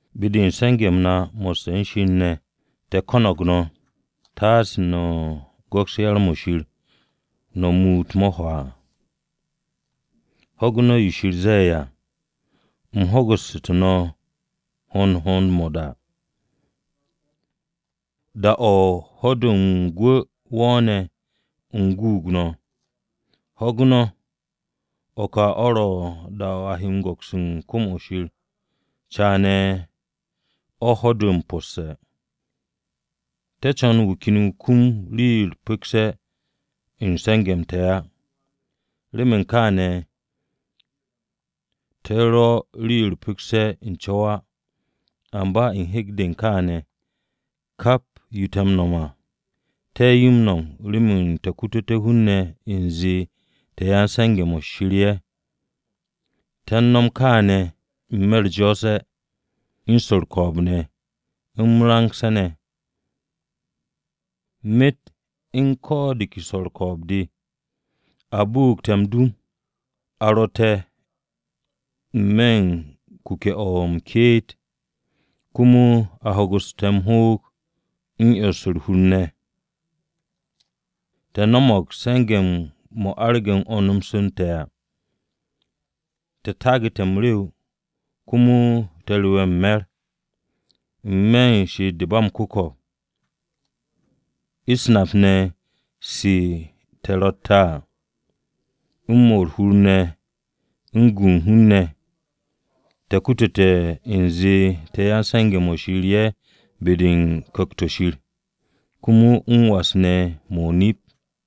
Be-de u̱n se̱nge̱-m na mo̱sse̱ u̱n Shir ne̱, te̱ ko̱no̱g no̱, taase no̱ go̱ks yar-mo̱ Shir, no̱ muut mo̱ hwaa. Ho̱gu̱ no̱ yo Shir ze̱e̱ à, “U̱m ho̱gu̱su̱te̱ no̱ u̱n hohond-mo̱ o-da. Da-o̱ ho̱-de u̱n gwu̱ wo̱o̱ne̱, u̱m guug no̱.” Ho̱gu̱ no̱! O̱ ka o̱ ro̱ da-o̱ no̱ he go̱ks u̱n kwu̱m-o̱ Shir, caane̱ o̱ ho̱-de u̱n m-posse̱! Te̱ co̱n wu̱ ken wu̱ kum rii-yo u̱r-pu̱kse̱ u̱n se̱nge̱-m te̱ á. Remen kaane̱, te̱ rwo̱ rii-yo u̱r-pu̱kse̱ u̱n co̱w á. Amba u̱n hek-de u̱n kaane̱, kap yo te̱ m-nom à, te̱ yo m-nom remen te̱ kututé̱ hun-ne̱ u̱nze te̱ ya-m-se̱nge̱-mo̱ Shir ye̱. Te̱ m-nom kaane̱ n-me̱ u̱r-jo̱o̱se̱, u̱n swo̱ u̱r-ko̱o̱b ne̱, m-rangse̱ ne̱, myet u̱n ko̱ de ke swo̱ u̱r-ko̱o̱b de. A bu'ug te̱ m-dum, a ru̱ te̱ n-me̱ u̱n kuke̱-o̱ m-ke'et, komo a hoogu̱su̱ te̱ m-hoog u̱n 'yons u̱r-hur ne̱; te̱ no̱mo̱g se̱nge̱-mo̱ arage̱ 'wo̱ns-m te̱ à, te̱ taagu̱te̱ m-rew komo te̱ rewe̱ u̱n me̱r. N-me̱ u̱n she'et-de ba m-ku̱ko̱p, u̱s-nap ne̱ se te̱ ro̱tte̱ à, u̱n 'mo̱ u̱r-hur u̱n gu hun-ne̱ ne̱, te̱ kutute̱ u̱nze te̱ yan-se̱nge̱-mo̱ Shir ye̱ be-de u̱n Ku̱kt-o̱ Shir, komo m-was ne̱ mo̱ o-nip.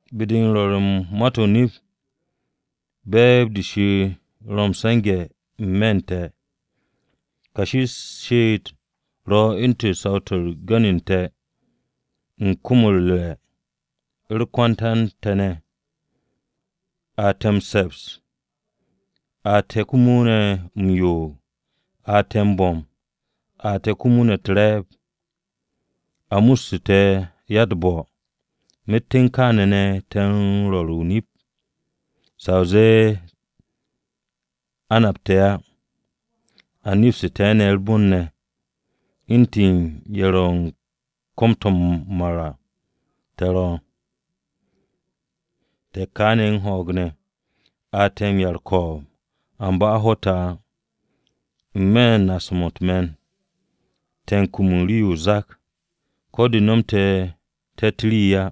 Be-de m-rwo̱r u̱n ma-u̱t te̱ to̱ o-nip, be̱e̱b-de Shir ro̱ m-se̱nge̱ n-me̱ u̱n te̱. Kashi u̱r-she'et ro̱ u̱ntu̱n saw-to̱ u̱r-gu̱n u̱n te̱, u̱n kom-o̱ u̱r-re̱ u̱r-kwanta u̱n te̱ ne̱. A te̱ m-se̱ps, a te̱ komo ne̱ m-yo'og, a te̱ bo̱m, a te̱ komo ne̱ u̱t-re̱e̱b. A mustu̱ te̱ ya-u̱t-bo̱, myet u̱n kaane̱ ne̱, te̱ m-rwo̱r o-nip. Sa o zee a nap te̱ á, a nepstu̱ te̱ ne̱ u̱r-bon ne̱, u̱ntu̱n ye̱ ro̱ u̱n kom-to̱ mar à te̱ ro, te̱ ka ne̱ u̱n ho̱o̱g ne̱, a te̱ m-'ya u̱r-ko̱o̱b, amba a ho̱ te̱ á, N-me̱ u̱n naase̱-mo̱ u̱t-me̱n, te̱ u̱n kum rii-yo o-zak. Ko̱ de̱ nomte̱ te̱tt rii á,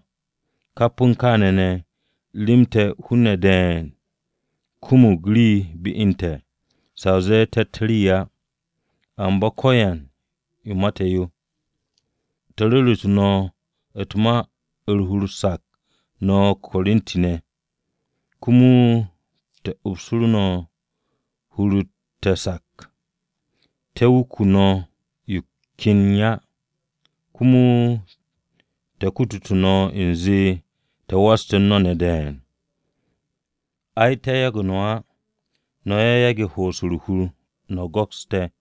kap u̱n kaane̱ ne̱, rem te̱ hun-ne̱ de̱e̱n kumug rii be u̱n te̱, sa o zee te̱tt rii á, amba ko̱yan yo ma te̱ yo. Te̱ ru̱ru̱tu̱ no̱ u̱t-ma u̱r-hur sak no̱ Korinti-ne̱, komo te̱ upsu̱tu̱ no̱ hur-u̱r te̱ cas. Te̱ wuke̱ no̱ yo ken á, komo te̱ kutute̱ no̱ u̱nze te̱ waste̱ u̱n no̱ ne̱ de̱e̱n. Ay, te̱ yage̱ no̱ á, no̱ ye̱ yage̱ ho'os u̱r-hur no̱ go̱ks te̱.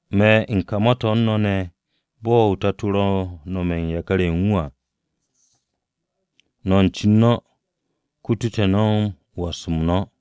Me̱ u̱n ka ma-to̱ u̱n no̱ ne̱ bo̱ tato-o ro̱ u̱n nome̱ u̱n yakar-ye̱ u̱n wu̱ à. No̱ u̱n cen no̱, kutu te̱ no̱ was-m no̱.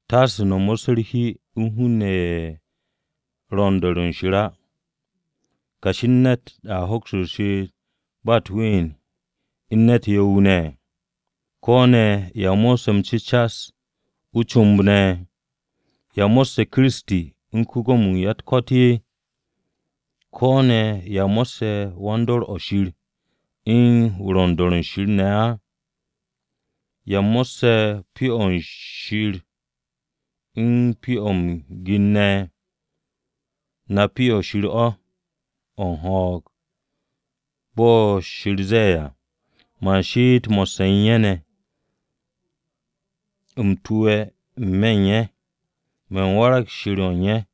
No̱ mo̱sse̱ u̱t-hi u̱n hun-ne̱ ne̱ ye̱ ro̱ u̱n do̱r o̱ Shir á. ¿Kashi u̱n ne̱t a hoks m-she'et ba u̱t-ween u̱n ne̱t yo̱-wu̱ ne̱? ¿Ko̱ ne̱ ya mo̱sse̱ m-cu̱cas o-comb ne̱? ¿Ya mo̱sse̱ Kiristi u̱n ko-Gwo̱mo-wu̱ u̱n ya-u̱t-ko̱t ne̱? ¿Ko̱ ne̱ ya mo̱sse̱ wan-dor o̱ Shir u̱n wu̱ ro̱ u̱n do̱r o̱ Shir ne̱ á? ¿Ya mo̱sse̱ Pyo-o̱ Shir u̱n pyo-o̱ m-gir ne̱? Na Pyo-o̱ Shir o̱, o̱ u̱n ho̱o̱g. Bo̱ Shir ze̱e̱ à, “Man she'et mo̱sse̱ u̱n ye̱ ne̱, u̱m tu̱we̱ n-me̱ u̱n ye̱. Man warag Shir o̱ u̱n ye̱,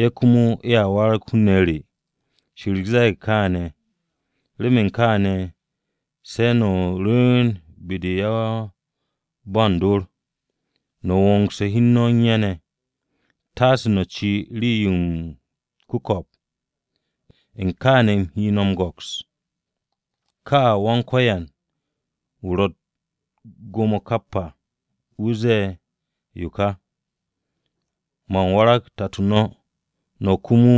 ye̱ komo ye̱a warag hun-ne̱ re.” “Yawe ze̱e̱g kaane̱, Remen kaane̱, se̱ no̱ rwu̱u̱n be-de u̱n yan-ba u̱n dor, no̱ wo̱ngse̱ hi u̱n no̱ u̱n ye̱ ne̱, Taase no̱ ci rii-yo m-ku̱ko̱p, u̱n kaane̱ u̱m he no̱ m-go̱ks.” “Yawe, wu̱ ro̱ Wa-u̱t-Gwo̱mo kap à, wu̱ ze̱e̱ yo ka: Man warag Tato no̱, no̱ komo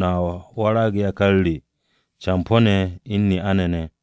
no̱a warag yakar re campo̱-ne̱ u̱n ne'a-ne̱ ne̱.”